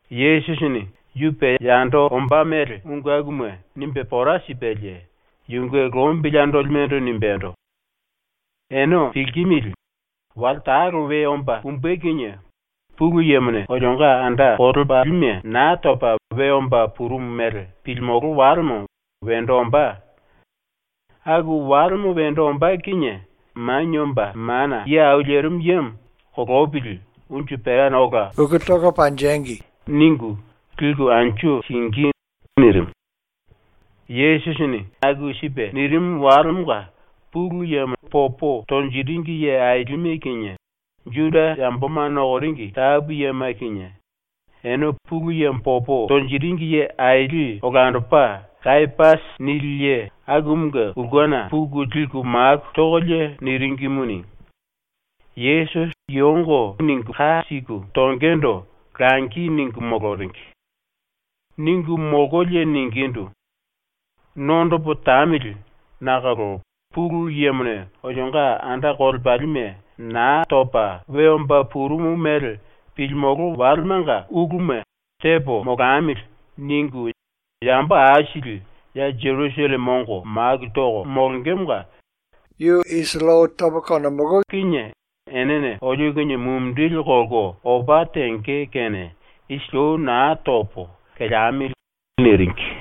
Yesusini ⸤yu pe yando ombá mele⸥ ungu akuma nimbe pora sipelie yunge lombili andolimendo nimbendo: “Ene pilkimili, wale talo we omba pumbe kinie Pulu Yemone olionga anda kolepalime Naa Topa We Omba Purumu Mele Pilimolo Walemo wendo ombá. Aku walemo wendo ombá kinie Manie Omba Mana Ye Au Lerimu Yemo “Kolopili unju perana ola uku tangi.” ningu liku anju singí.” nirimu. Yesusini aku sipe nirimu walemonga Pulu Yemo popo tonjiringi ye ailime kinie, Juda yamboma nokoringi tapu yema kinie, ene Pulu Yemo popo tonjiringi ye aili olandopa ‘Kayapasi’ nili ye akumunge ulkena puku liku maku tokolie niringimuni, Yesusi kiyongo ningu ka siku tongendo langi ningu moloringi. Ningu molkolie ningindu: “⸤Nondopo tamili,⸥ nakolo Pulu Yemone olionga anda kolepalime Naa Topa We Omba Purumu Mele Pilimolo Walemanga ⸤‘uluma tepo molamili.’ ningu⸥ yambo aisili ya Jerusalleme ongo maku toko molongemonga yu isili ou tomolo kinie enene olio kinie mumindili kolko opa tenge kene isili ou na topo, keleamili.” niringi.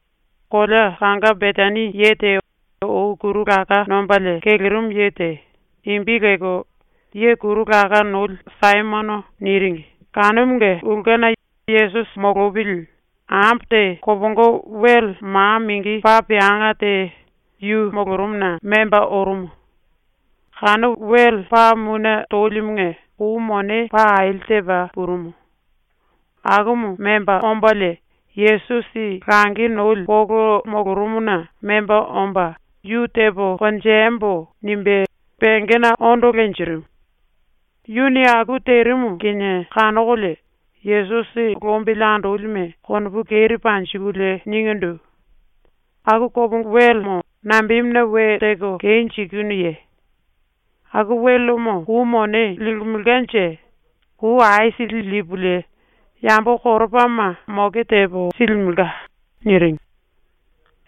Kolea kanga Betani ye te ou kuru laká nombalie kelerimu ye te, imbi lelko “Ye Kuru Laká Noli Saimono” niringi kanumunge ulkena Yesusi molopili ambo te kopongo wele ma mingi paa peanga te yu molorumuna memba orumu. Kanu wele paa mune tolimunge kou mone paa aili tepa purumu. Akumu memba ombalie Yesusi langi noli polo molorumuna memba omba ⸤‘Yu tepo konjembo.’ nimbe⸥ pengena ondo lenjirimu. Yuni aku terimu kinie kanokolie Yesusi lombili andolime konopu keri panjikulie ningindu: “Aku kopongo welemo nambemuna we teko kenjikinuye? Aku welemo kou mone limelkanje kou aisili lipulie yambo koropama moke tepo silimelka.” niringi.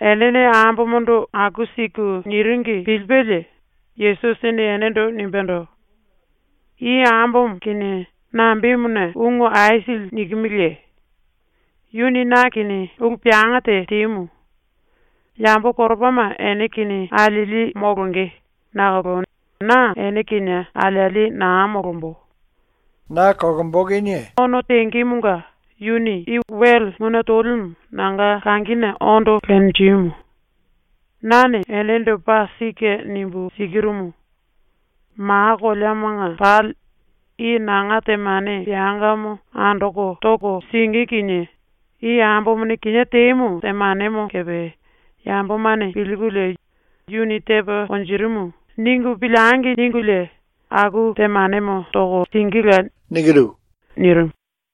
⸤Enene ambomondo⸥ aku siku ⸤niringi⸥ pilipelie Yesusini enendo nimbendo: “I ambomo kinie nambemuna ungu aisili nikimiliye? Yuni na kinie ulu peanga te temu. Yambo koropama ene kinie alieli molonge nakolo na ene kinie alieli na molombo. Na ono tengemonga yuni i wele mune tolimu nanga kangine ondo lenjimu. Nane enendo paa sike nimbu sikirumu: Ma koleamanga pali i ⸤nanga⸥ temane peangamo andoko toko singí kinie i ambomone kinié temu temanemo kepe ‘Yambomane pilkulie ‘Yuni tepa konjirimu.’ ningu piliengi!’ ningulie aku temanemo toko singíla.” nirimu.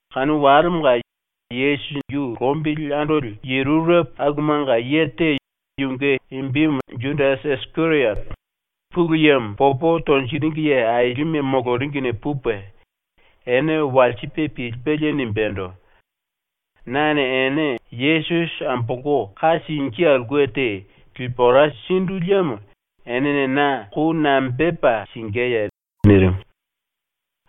Kanu walemonga Yesusi yu lombili andoli ye rurepo akumanga ye te, yunge imbimu Judasi Isikeriote, Pulu Yemo popo tonjiringi ye ailime moloringine pupe, ene walsipe pilipelie nimbendo: “Nane ene Yesusi ambolko ka singí aulke te lipu ora sindu liemo enene na ⸤kou⸥ nambepa singíye?” nirimu.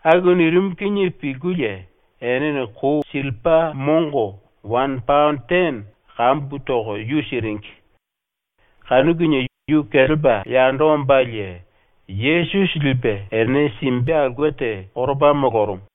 ⸤Aku nirimu kinie pilkulie⸥ enene kou sillipa mongo wane paono tene kambu toko yu siringi. Kanu kinie yu kelepa yando ombalie Yesusi lipe ene simbe aulke te koropa molorumu.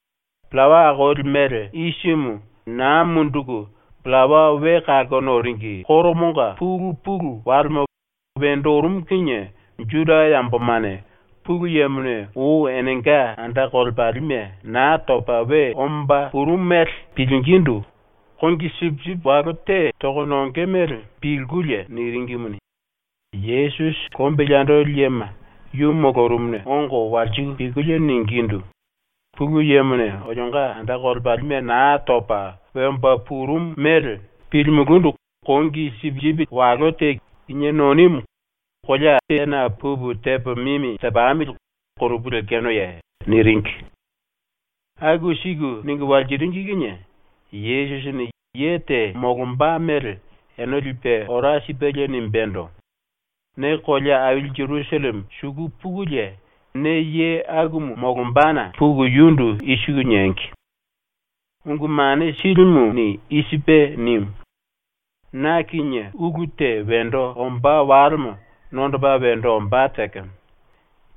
Pillawa Akoli Mele Isimu Naa Munduku Pillawa We Kalko Noringi Koromonga pulu pulu walemo wendo orumu kinie ⸤Juda yambomane Pulu Yemone ou enenga anda kolepalime Naa Topa We Omba Purumu mele pilingindu kongi sipisipi walo te toko nonge mele pilkulie niringimuni,⸥ Yesusi lombili andoli yema yu molorumuna ongo walsiku pilkulie ningindu: “Pulu Yemone olionga anda kolepalime Naa Topa We Omba Purumu mele pilimulúndu kongi sipisipi walo te kinié nonimu kolea tena pupu tepo mimi tepamili konopu lekenoye?” niringi. ⸤Aku siku ningu walsiringi kinie⸥ Yesusini ⸤ye te molomba mele ene lipe ora sipelie⸥ nimbendo: “Ne kolea aili ⸤Jerusalleme⸥ suku pukulie, ne ye akumu molombana puku yundu i siku niengi: “Ungu Mane Silimuni i sipe nimu: “Na kinie ulu te wendo ombá walemo nondopa wendo ombá tekemo.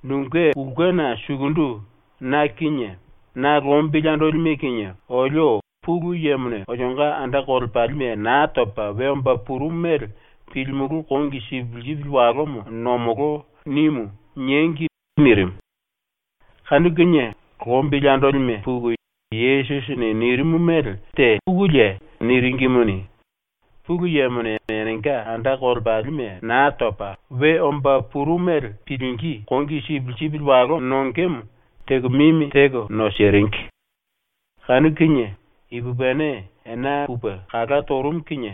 Nunge ulkena sukundu na kinie na lombili andolime kinie olio Pulu Yemone olionga anda kolepalime Naa Topa We Omba Purumu mele pilimulú kongi sipisipi walomo nomolo.” nimu.” niengi.” nirimu. Kanu kinie lombili andolime puku Yesusini nirimu mele tepukulie niringimuni, Pulu Yemone enenga anda kolepalime Naa Topa We Omba Purumu mele pilingí kongi sipisipi walo nongemo teko mimi teko nosiringi. Kanu kinie, ipupini ena pupe kala torumu kinie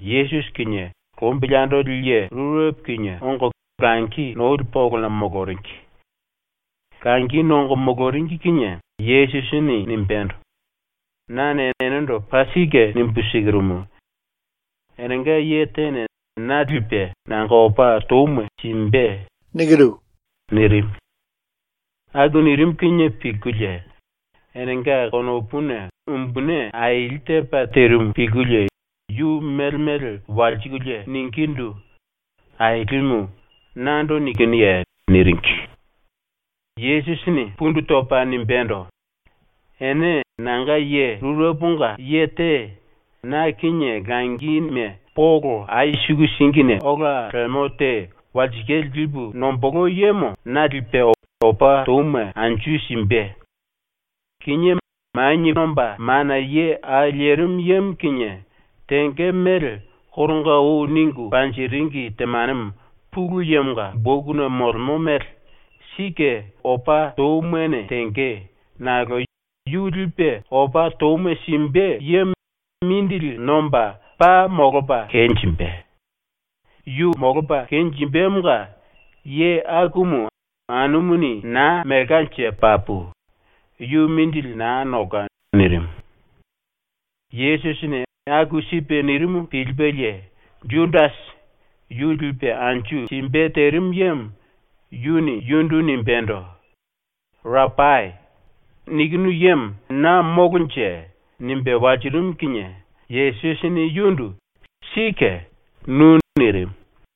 Yesusi kinie lombili andoli ye rurepo kinie ⸤ongo⸥ langi noli polona moloringi. Langi nongo moloringi kinie Yesusini nimbendo: “Nane enendo paa sike nimbu sikirumu: Enenga ye tene na lipe nanga opa touma simbe.” nirimu. ⸤Aku nirimu kinie pilkulie⸥ enenga konopuna umbuni aili tepa terimu pilkulie yu mele mele walsikulie ningindu: “Ailimu, nando nikinuye?” niringi. Yesusini pundu topa nimbendo: “⸤Ene nanga ye rureponga⸥ ye te na kinie langime polo ai suku singine ola lemo te walsikale lipu nombolo yemone na lipe, opa touma anju simbe. Kinié Manie Omba Mana Ye Au Lerimu Yemo kinie tenge mele koronga ou ningu panjiringi temanemo ⸤Pulu Yemonga⸥ bokuna molemo mele sike opa toumane tenge, nakolo yu lipe opa touma simbe yemo mindili nomba paa molopa kenjimbe. Yu molopa kenjimbemonga ye akumu anumuni na melkanje papu. Yu mindili na nolka.” nirimu. Yesusini aku sipe nirimu pilipelie Judasi, yu lipe anju simbe terimu yemo, yuni yundu nimbendo: “Rapai, nikinu yemo na molonje?” nimbe walsirimu kinie Yesusini yundu “Sike, nu.” nirimu.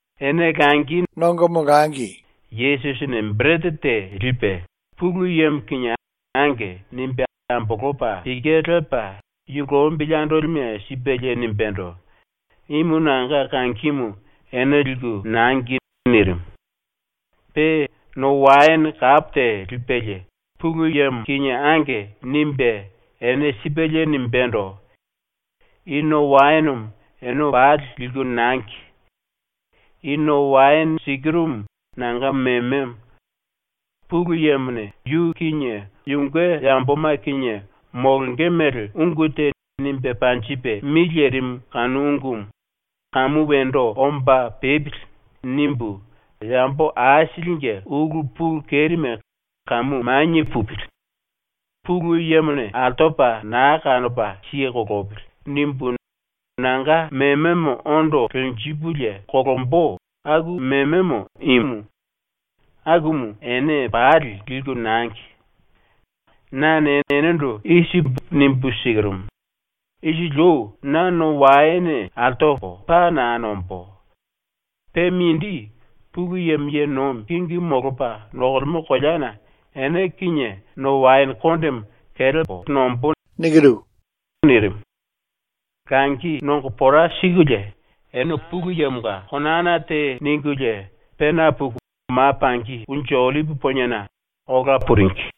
Ene langi nongo moloringi kinie Yesusini berete te lipe Pulu Yemo kinie “Ange.” nimbe ambolopa pike lepa yu lombili andolime sipelie nimbendo: “Imu nanga kangimu ene liku nangi.” nirimu. Pe no waene kapo te lipelie Pulu Yemo kinie “Ange.” nimbe ene sipelie nimbendo: “⸤I no waenemo⸥ ene pali liku nangi. I ⸤no waene⸥ sikirumu nanga mememo. Pulu Yemone ⸤yu kinie yunge yamboma kinie molonge mele⸥ ungu te nimbe panjipe mi lerimu kanu ungumu ‘Kamu wendo omba pepili.’ nimbu ‘Yambo aisilinge ulu pulu kerime kamu manie pupili. Pulu Yemone altopa na kanopa siye kolopili.’ nimbu nanga mememo ondo lenjipulie ⸤kolombo⸥ aku mememo imu. Akumu ene pali liku nangi. Nane enendo i sipu nimbu sikirumu: Isili ou na no waene altopo paa na nombó. Pe mindi, Pulu Yemo ye nomi kingimu molopa nokolemo koleana ene kinie no waene kondemo kelepo nombó.” nirimu. ⸤Langi nongo pora sikulie⸥ ene Pulu Yemonga konana te ningulie, pena puku ma pangi Unju Ollipi Poniena ola puringi.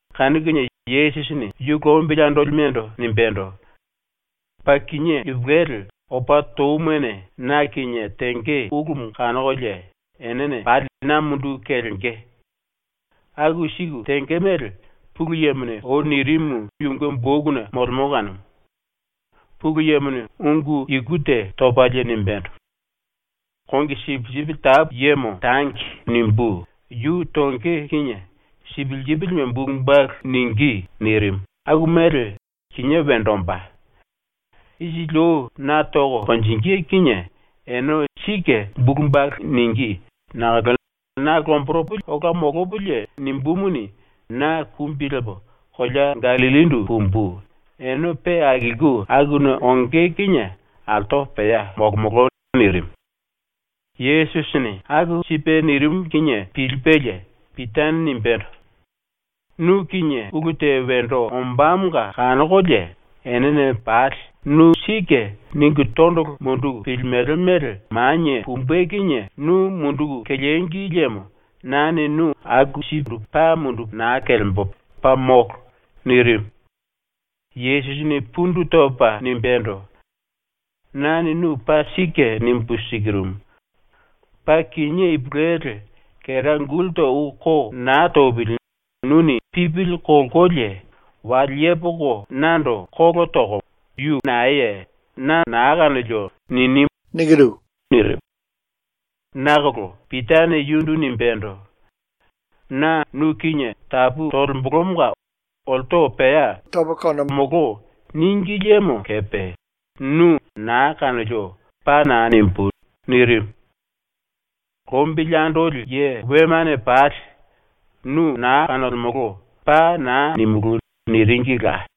Kanu kinie Yesusini yu lombili andolimendo nimbendo: “Paa kinié ipulueli ⸤opa toumane⸥ na kinie tenge ulumu kanokolie enene pali na munduku kelenge. ⸤Aku siku tenge mele⸥ Pulu Yemone ou nirimu yunge bokuna molemo kanumu. Pulu Yemone ⸤ungu iku te topalie⸥ nimbendo: “ “Kongi sipisipi tapu yemo tangi.” nimbú, yu tonge kinie sipisipime bulu balu ningí.” nirimu, ⸤aku mele kinié wendo ombá⸥. ⸤Isili ou na toko konjingí kinie ene sike bulu balu ningí⸥ nakolo na lomboropo ola molopolie nimbumuni, na kumbi lepo kolea Gallillindu pumbu, ⸤ene pe akilku akuna onge kinie altopo pea molomolo⸥.” nirimu. ⸤Yesusini aku sipe nirimu kinie pilipelie⸥ Pitane nimbendo: “Nu kinie ulu te wendo ombámonga kanokolie enene pali ‘Nu sike.’ ningu tondolo munduku pilimele mele manie pumbe kinie nu munduku kelengi liemo nane nu aku sipe paa mundupu na kelembo, paa molo.” nirimu. Yesusini pundu topa nimbendo: “Nane nu paa sike nimbu sikirumu: Paa kinié ipulueli, kera gulta ou ko na topili nuni ⸤pipili kolkolie⸥ wale yepoko nando kolo toko “Yu naeye? Na na kanolio.” nini.” nirimu. Nakolo Pitane yundu nimbendo: “Na nu kinie tapu tolembolomonga olto pea “Tomolo.” níngi liemo kepe nu “Naa kanolio.” paa na nimbú.” nirimu. Lombili andoli ye wemane pali “ “Nu na kanolemolo.” paa na nimulú.” niringila.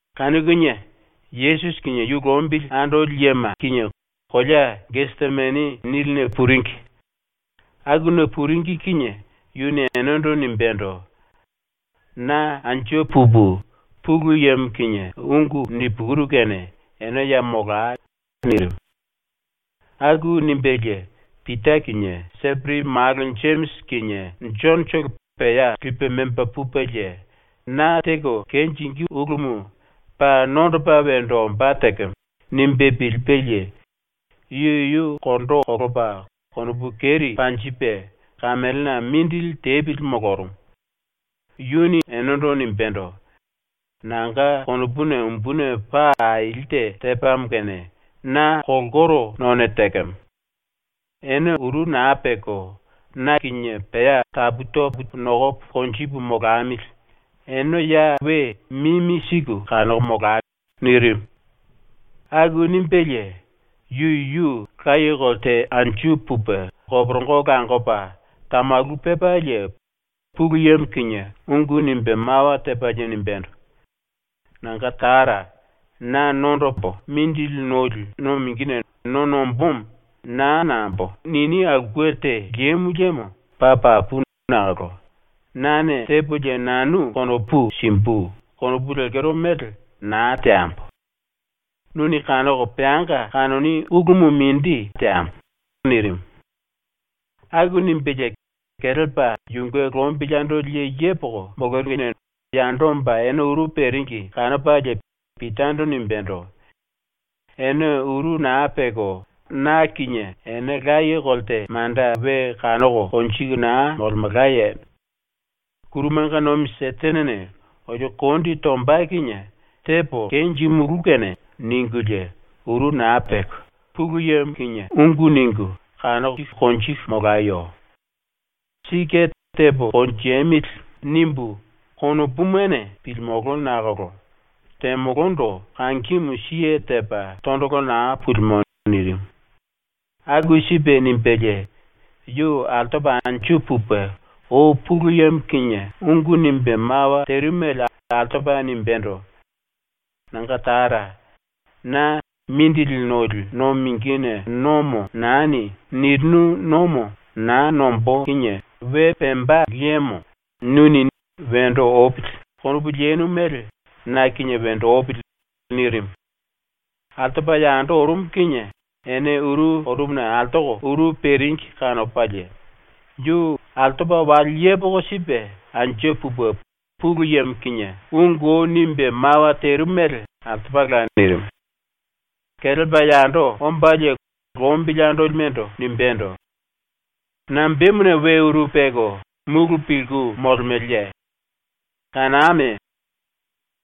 Kanu kinie Yesusi kinie yu lombili andoli yema kinie kolea ‘Gesemani’ niline puringi. ⸤Akuna puringi⸥ kinie yuni enendo nimbendo: “Na anju pupu Pulu Yemo kinie ungu nipukuru kene ene ya molai.” nirimu. Aku nimbelie Pita kinie Seperi malo ⸤Jemisi kinie Jonotolo⸥ pea lipe memba pupelie ⸤‘Na teko kenjingí ulumu paa nondopa wendo ombá tekemo.’ nimbe pilipelie⸥ yu yuyu kondo kolopa konopu keri panjipe kamelena mindili tepili molorumu. Yuni enendo nimbendo: “Nanga konopuna umbuni paa aili te tepamo kene na kolkoro none tekemo. Ene uru na peko na kinie pea tapu topo nokopo konjipu molamili, ene ya we mimi siku kanoko molai.” nirimu. ⸤Aku nimbelie⸥ yu yuyu laye kolte anju pupe koporongo langopa tamalu pepalie Pulu Yemo kinie ungu nimbe mawa tepalie nimbendo: “Nanga Tara, na nondopo ⸤mindili noli⸥ no mingine no nombómo ‘Naa nambo.’ nini aulke te lemo liemo paa papu nakolo ‘Nane tepolie nanu konopu simbu.’ konopu lekero mele na teambo. Nuni kanoko peanga kanoni ulumu mindi teambo.” nirimu. Aku nimbelie kelepa yunge lombili andoli ye yepoko moloringine yando omba ene uru peringi kanopalie Pitando nimbendo: “Ene uru na peko na kinie ena laye kolte manda we kanoko konjiku na molemelkaye? ‘⸤Kurumanga nomi Setenene⸥ olio kondi tomba kinie tepo kenjimulú kene.’ ningulie ⸤uru na peko⸥ Pulu Yemo kinie ungu ningu kanoko konjiku molayo. Sike ‘tepo konjemili.’ nimbu konopumane pilimolo nakolo temolondo kangimu siye tepa tondolo na pulimo.” nirimu. Aku sipe nimbelie yu altopa anju pupe ou Pulu Yemo kinie ungu nimbe mawa terimu mele altopa nimbendo: “Nanga Tara, na ‘⸤Mindili noli⸥ no mingine nomo nani.’ nirinu nomo na nombó kinie we pemba liemo nuni ‘Wendo opili.’ konopu leno mele na kinie wendo opili.” nirimu. Altopa yando orumu kinie ene uru orumuna altoko uru peringi kanopalie yu altopa wale yepoko sipe anju pupe Pulu Yemo kinie ungu ou nimbe mawa terimu mele altopala nirimu. Kelepa yando ombalie lombili andolimendo nimbendo: “Nambemuna we uru peko mulu pilku molemeleye? Kaname! Yemone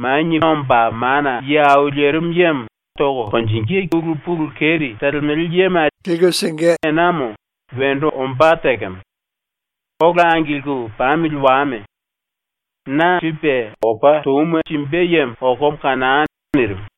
Manie Omba Mana Ye Au Lerimu Yemo ⸤tonge⸥ ulu pulu keri telemele yema lipe simbe enamo wendo ombá tekemo. Ola angilku pamili wame! Na lipe anju simbe yemo okomo kanai!” nirimu.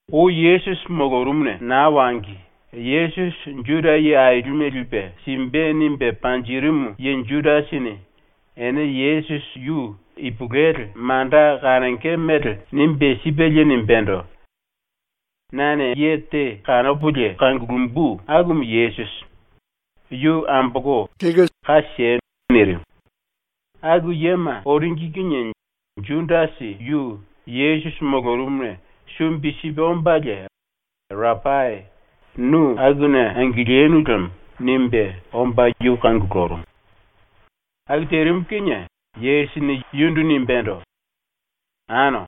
Ou Yesusi molorumuna naa wangi Yesusi Juda ye ailime lipe simbe nimbe panjirimu ye ⸤Judasini⸥ ene Yesusi yu ipulueli manda kanonge mele nimbe sipelie nimbendo: “Nane ye te kanopolie kangulumbu akumu Yesusi. Yu ambolko ka siei.” nirimu. ⸤Aku yema⸥ oringi kinie ⸤Judasi⸥ yu Yesusi molorumuna sumbi sipe ombalie “Rapai, nu akuna angilinu lemo.” nimbe omba yu kangulurumu. Aku terimu kinie Yesusini yundu nimbendo: “Ano,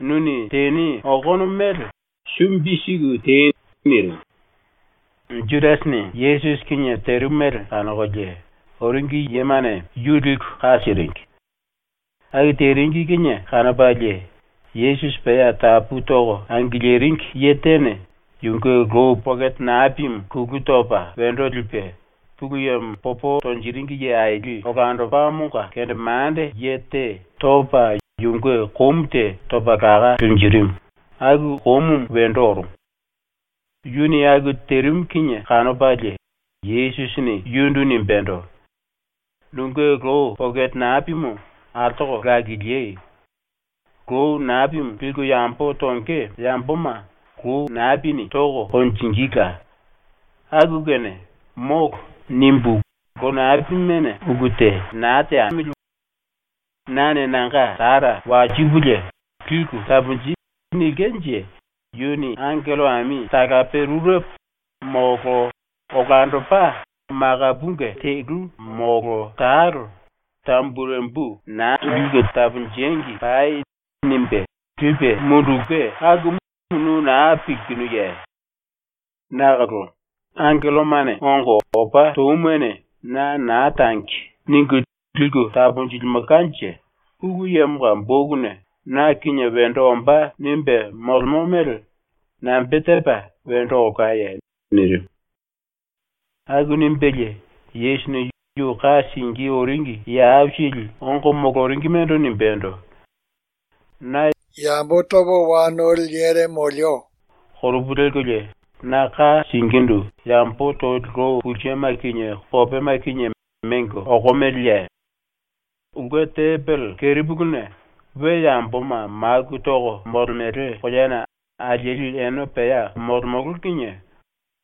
nuni teni okono mele sumbi siku tei.” nirimu. ⸤Judasini Yesusi kinie terimu mele⸥ kanokolie oringi yemane yu liku ka siringi. Aku teringi kinie kanopalie Yesusi pea tapu toko angiliringi ye tene yunge lou pokete napimu kulu topa wendo lipe Pulu Yemo popo tonjiringi ye aili olandopamonga kendemande ye te topa yunge komu te topa laká lenjirimu, aku komumu wendo orumu. ⸤Yuni aku terimu kinie kanopalie⸥ Yesusini yundu nimbendo: “Nunge lou pokete napimu altoko lakilí! Lou napi liku yambo tonge yamboma lou napini toko konjingíla, aku kene ⸤‘Molo.’ nimbu lou napimene ulu te na teamili⸥. Nane nanga Tara walsipulie “Liku taponji.” nilkenje yuni angello ami talape rurepo, molo olandopa malapunge telu molo talo, tamburembu na “Liku taponjengi pai.” nimbe lipe mundulke akumu nu na pilkinuye? Nakolo ⸤angellomane ongo opa toumane na ‘na tangi.’ ningu liku taponjilimelkanje⸥ Pulu Yemonga bokuna na kinie wendo ombá nimbe molemo mele nambe tepa wendo olkaye?” nirimu. ⸤Aku nimbelie⸥ Yesusini ⸤yu ka singí oringi⸥ ye aisili ongo moloringimendo nimbendo: “Na ‘yambo topa wa noli yere molemo.’ konopu lelkolie na ka singíndu yambo toli lou pulsema kinie kopema kinie mengo okomeleye? Ulke tembele ⸤kerepuluna we yamboma maku toko molemele⸥ koleana alieli ene pea molemolo kinie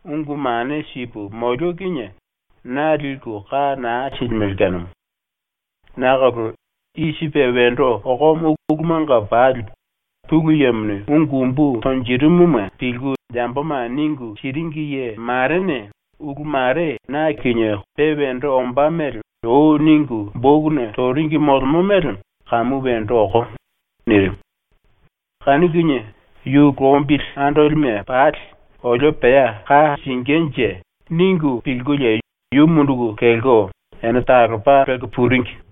ungu mane sipu molio kinie na liku ka na silimele kanumu. Nakolo i sipe wendo okomo ulumanga pali Pulu Yemone ungu umbu tonjirimuma pilku yamboma ningu siringi ye marene ulu mare ⸤na kinie⸥ pe wendo ombá mele ou ningu bokuna toringi molemo mele kamu wendo okomo.” nirimu. Kanu kinie yu lombili andolime pali ⸤‘Olio pea ka singínje.’ ningu pilkulie⸥ yu munduku kelko ene talopa lelko puringi.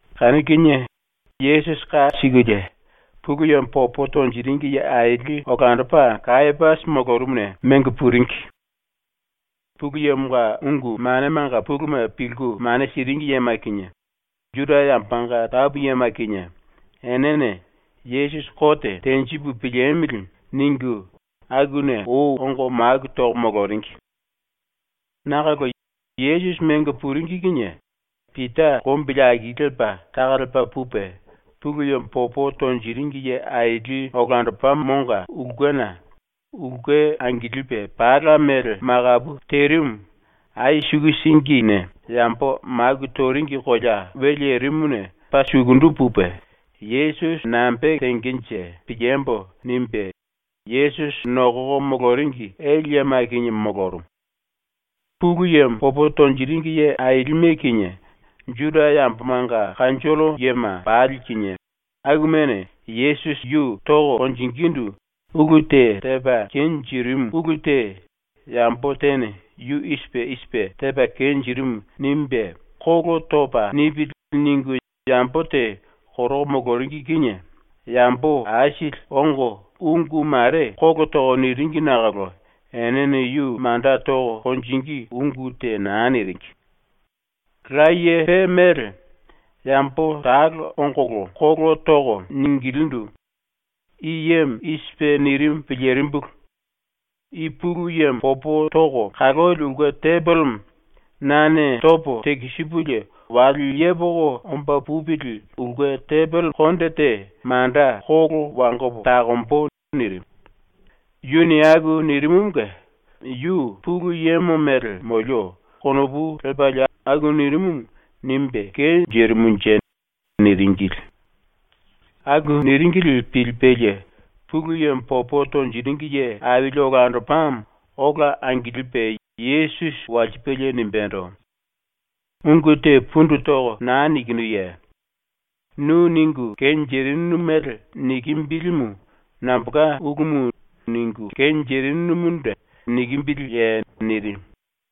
Kanu kinie Yesusi ka sikulie Pulu Yemo popo tonjiringi ye aili olandopa Kayapasi molorumuna mengo puringi. Pulu Yemonga ungu manemanga puluma pilku mane siringi yema kinie, Juda yambomanga tapu yema kinie, enene ⸤‘Yesusi kote tenjipu piliemili.’ ningu⸥ akuna ou ongo maku toko moloringi. Nakolo ⸤Yesusi mengo puringi kinie⸥ Pita lombili aki lipe taka lepa pupe, Pulu Yemo popo tonjiringi ye aili olandopamonga ulkena, ulke angilipe pala mele makapu terimu, ai suku singine yambo maku toringi kolea we lerimuna paa sukundu pupe, ‘Yesusi nambe tengenje piliembo.’ nimbe ⸤Yesusi nokoko moloringi⸥ ele yema kinie molorumu. Pulu Yemo popo tonjiringi ye ailime kinie, Juda yambomanga kanjollo yema pali kinie, akumane Yesusi yu toko konjingindu ulu te tepa kenjirimu ulu te ‘Yambo tene ‘yu i sipe i sipe tepa kenjirimu.’ nimbe kolo topa nipili.’ ningu yambo te koroko moloringi kinie yambo aisili ongo ungu mare kolo toko niringi nakolo enene yu manda toko konjingí ungu te na niringi. Laye pe mele yambo talo ongolo ⸤kolo toko⸥ ningilindu: “I yemo i sipe nirimu ⸤pilirimbulu⸥: “I Pulu Yemo ⸤popo toko kaloli⸥ ulke tembelemo nane topo tekisipulie wale yepoko omba pupili ulke tembele ⸤konde⸥ te manda kolo wangopo takombo.” nirimu. ⸤Yuni aku nirimumunge ‘Yu Pulu Yemo mele molio.’ konopu lepalie aku nirimumu nimbe kenjirimunje⸥.” niringili. Aku niringili pilipelie Pulu Yemo popo tonjiringi ye aili olandopamo ola angilipe Yesusi walsipelie nimbendo: “Ungu te pundu toko na nikinuye? Nu ⸤ningu kenjirinu mele⸥ nikimbilimu nambolka ulumu ningu kenjirinumundu nikimbiliye?” nirimu.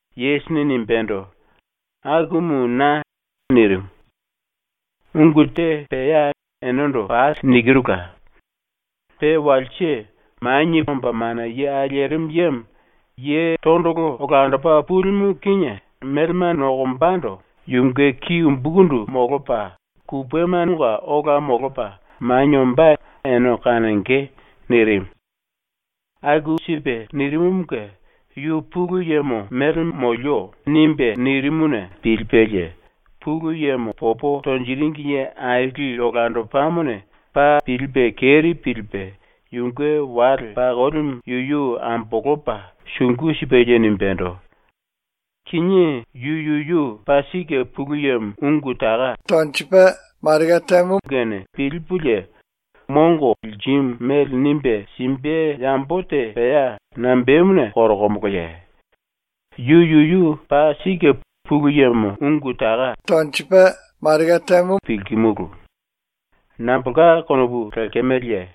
Yesusini nimbendo: “Akumu na.” ⸤nirimu⸥. “Ungu te pea enendo pali nikirula. Pe walse Manie Omba Mana Ye Au Lerimu Yemo, Ye Tondolo Olandopa Pulimu ⸤kinie melema nokombando⸥ yunge ki umbukundu molopa, kupemanga ola molopa manie ombá ene kanonge.” nirimu. Aku sipe nirimumunge ⸤‘Yu Pulu Yemo mele molio.’ nimbe nirimuna⸥ pilipelie Pulu Yemo popo tonjiringi ye aili olandopamone ⸤paa pilipe keri pilipe⸥ yunge wale pakolimu yuyu ambolopa sungu sipelie nimbendo: “Kinié yu yuyu paa sike Pulu Yemo ungu taka tonjikimu kene pilipulie mongo lirimu mele nimbe simbe yambo te pea nambemuna koromoloye? Yu yuyu paa sike Pulu Yemo ungu taka tonjikimu pilkimulu. Nambolka konopu lekemeleye?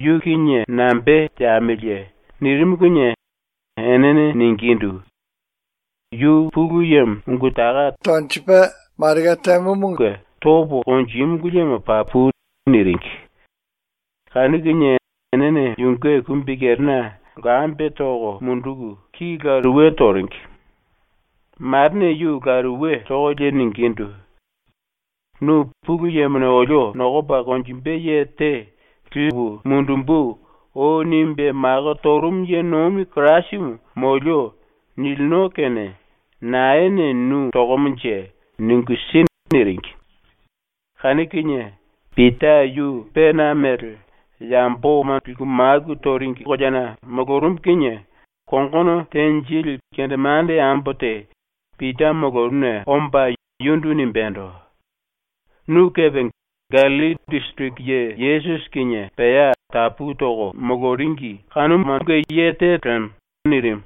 ⸤Yu kinie nambe teamiliye?⸥” nirimu kinie enene ningindu: “Yu Pulu Yemo ungu taka tonjimumunge topo konjímulu liemo papu.” niringi. Kanu kinie enene yunge kumbikerena lkambe toko munduku, ki lumuni toringi. Marene yu laruwe tokolie ningindu: “Nu ‘Pulu Yemone olio nokopa konjimbe ye te “Lipu mundumbu.” ou nimbe mako torumu ye nomi Kirasimu molio.’ nilino kene naene nu tokomonje ningu si.” niringi. Kanu kinie Pita yu pena mele, yamboma liku maku toringi koleana molorumu kinie kongono tenjili kendemande ambo te Pita molorumuna omba yundu nimbendo: “Nu kepe Gallilli disiriki ye Yesusi kinie pea tapu toko moloringi kanumanga ye te lemo.” nirimu.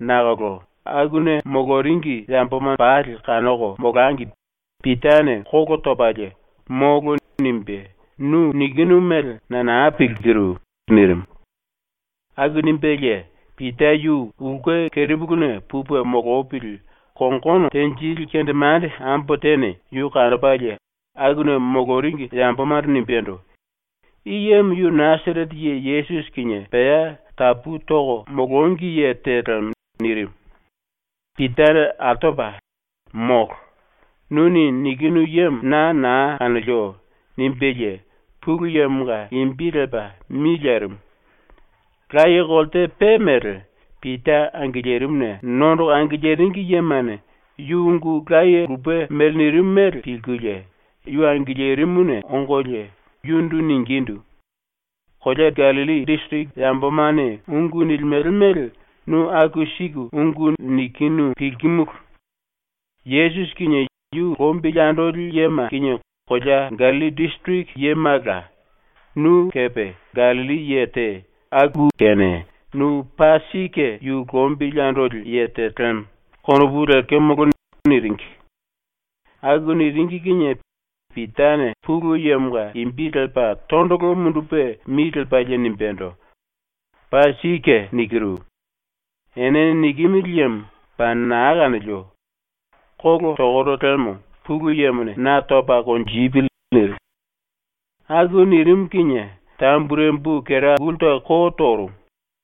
Nakolo akuna moloringi yamboma pali kanoko molangi Pitane kolo topalie “Molo.” nimbe “Nu nikinu mele na na pilkiru.” nirimu. Aku nimbelie Pita yu ulke kerepuluna pupe molopili kongono tenjili kendemande ambo tene yu kanopalie akuna moloringi yambomando nimbendo: “I yemo yu Nasarete ye Yesusi kinie pea tapu toko molongi ye te lemo.” nirimu. Pitane altopa “Molo. Nuni nikinu yemo na na kanolio.” nimbelie Pulu Yemonga imbi lepa mi lerimu. Laye kolte pe mele, Pita angilirimuna nondoko angiliringi yemane ⸤yu ungu laye lupe mele nirimu mele pilkulie⸥ yu angilirimuna ongolie yundu ningindu: “Kolea Gallilli disiriki yambomane ungu nilimele mele nu aku siku ungu nikinu pilkimulu. ⸤Yesusi kinie yu lombili andoli yema kinie kolea Gallilli disiriki yemala,⸥ nu kepe Gallilli ye te, aku kene ‘Nu paa sike yu lombili andoli ye te lemo.’ konopu lekemolo.” niringi. Aku niringi kinie Pitane Pulu Yemonga imbi lepa tondolo mundupe mi lepalie nimbendo: “Paa sike nikiru. Ene nikimili yemo paa na kanolio. Kolo tokoro liemo Pulu Yemone na topa konjipili.” nirimu. Aku nirimu kinie tamburembu kera gulta ko torumu.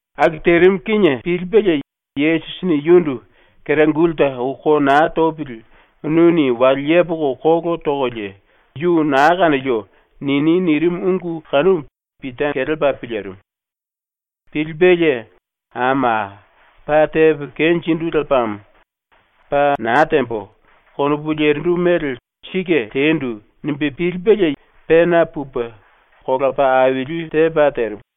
Aku terimu kinie pilipelie Yesusini yundu “Kera gulta ou ko na topili nuni wale yepoko kolo tokolie “Yu na kanolio.” nini.” nirimu ungu kanumu Pita kelepa pilirimu. Pilipelie ⸤‘Ama, paa tepo kenjindu lepamo. ‘Paa na tembo.’ konopu lerindu mele sike tendu.’ nimbe pilipelie⸥ pena pupe kola paa aili tepa terimu.